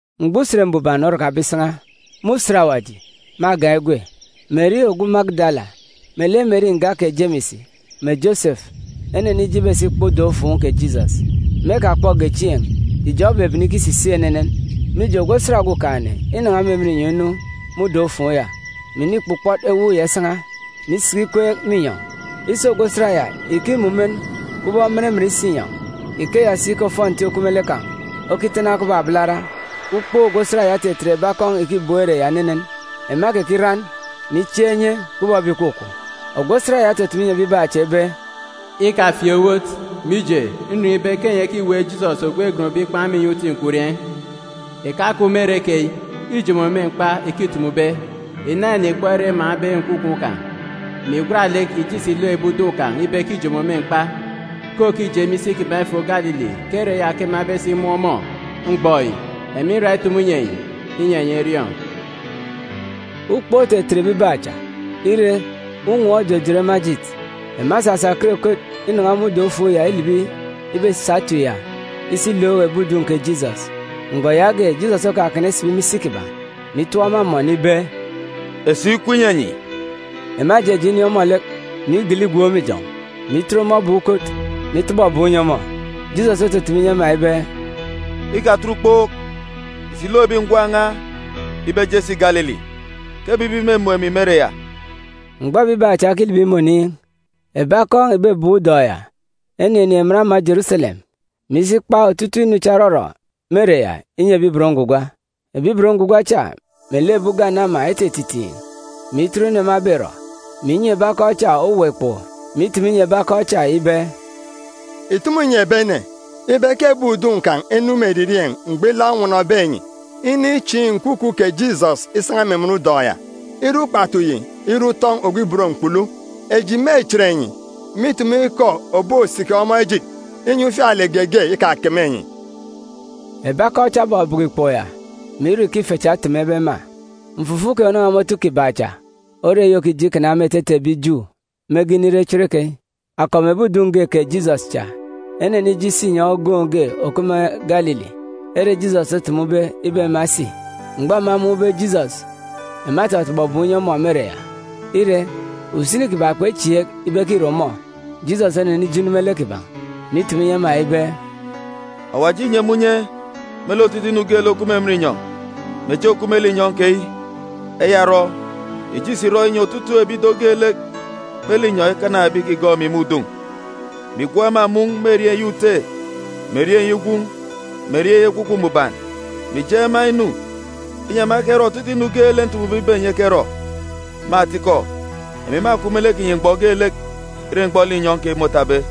Mgbọ Usen Mbuban orakabe isan̄a, me usen ògọọk Usen Mbuban, me agan̄ egwe, Meri ogwu Magidala, melek Meri nga kè Jemis mè Josefu, enenije ibesi ikpọ udọn̄-ufuun̄ kè Jisọs. Me ekakpọge chieen̄, ijọn̄ osisisik atalek unye unye, mije ogwu osat Okumugwem înan̄a me emen inyọn̄ inu me udọn̄-ufuun̄ ya, mè inikpukpọt ewuuk ya isan̄a, mè isiki ikweek me inyọn̄. Isi ogwu osat ya ìkimumen kubọk omumen-inyọn̄. Ikeya si ke ofọnti òkup me lek kan̄ okitana kubọk abalara. Ukpook ogwu osat ya otetet ebi akọn̄ ìkibem ere ya enenen. Ema ekekiran, mè ichiaak inye kubọk ebi ìkwakwaan̄. Ogwu osat ya otutumu inyi ebibaan̄ cha ibe, “Ikafieek owot, mije, nriọọn̄ ibe kè enyi ekiweek Jisọs ogwu egonbe ikpan̄ me inyọn̄ uti nkwurieen̄. Ìkakup me ere keyi. Îjomo me mkpa ike îtumube. Ìna ìnikpọ ere emaan̄be nkwukwu kan̄, mè ìgwat lek ìje ìsi ìlook ebi udun̄ kan̄ ibe ke îjomo me mkpa; ke òkije me isi kiban̄ ifo Galili; ke ere ya ke ema ebesi imun̄ ọmọ. Mgbọ yi, emi nra itumu inyi enyi, inyi enyi eriọọn̄.” Ukpook otetet ebibaan̄ cha. Ire, unwọọn̄ ojojot ema ejit. Ema esasa ekot ekot inan̄a me udọn̄-ufuun̄ ya ilibi ibesa etip ya isi ilook ebi udun̄ kè Jisọs. Mgbọ yaage, Jisọs okakana isibi me isi kiban̄, mè itọp ema amọn ibe, “Esuuk ikup inyi enyi!” Ema ejeje inin̄ ọmọ lek, mè igele igwook me ijọn̄, mè itet ọmọ ebek ukot, mè itọbọ ebum inyi ọmọ. Jisọs otutumu inyi ema ibe, “Ikatet ukpook! Ìsi ìlook ebi ngwan̄ n̄a ibe eje esi Galili, ke ebibi mêmun̄ emi me ere ya.” Mgbọ ebibaan̄ cha ekilibi me oniin̄, ebi akọn̄ ìbebem udọn̄ ya eninin̄ emen ama Jeruselem, mè isi ikpa otutuuk inu cha òrọrọ me ere ya inyi ebi ibot ngwugwa. Ebi ibot ngwugwa cha melek ebi ugane ama etititiin̄, mè itọt inu ema eberọ, mè inyi ebi akọn̄ cha owuwa ikpoko, mè itumu inyi ebi akọn̄ cha ibe, “Ìtumu ìnyi ebi ene ibe ke ebi udun̄ kan̄ enu me eririeen̄ mgbọ ilaak onwọnọbe enyi inichiin̄ nkwukwu kè Jisọs isan̄a me emen udọn̄ ya. Ire ukpatu yi ire utọn̄ ogwu ibot mkpulu, eji mêchit enyi, mè itumu ikọ òbosiki ọmọ ejit, inyi ufialek geege ikakeme enyi.” Ebi akọn̄ cha ebọbọkọ ikpoko ya, mè irọ ike ife cha etemebe ema. Mfufuk keyi ònan̄a me otu kiban̄ cha ore eyi òkije ikana me etete ebi Ju mege inire cherekeyi. Akọp mè ebi udun̄ ge kè Jisọs cha enenije isi inyọn̄ ogoon̄ ge òkup me Galili, ere Jisọs otumube ibe ema esi. Mgbọ ema emun̄be Jisọs, ema etọtọbọ ebum inyi ọmọ me ere ya. Ire, usini kiban̄ kpechieek ibe ke îre ọmọ. Jisọs onenije inu me lek kiban̄, mè itumu inyi ema ibe, “Awaji înyi emi unye me lek otutuuk inu geelek òkup me emen inyọn̄, mè echi òkup me linyọn̄ keyi. Eya orọ, ìje ìsi ìrọ inyi otutuuk ebi ido geelek me linyọn̄ ekana ebi ìkigọọk emi me udun̄, mè ìgwook ema mun̄ me erieen̄ eyi Ute, mè erieen̄ eyi Gwun̄, mè erieen̄ eyi Ekwukwu Mbuban, mè ìjeen̄ ema inu, inyi ema ekerọ otutuuk inu geelek ntumube ibe enyi ekerọ. Me atikọ, emi mâkup melek kinyi mgbọ geelek, ire mgbọ linyọn̄ keyi môtabe.”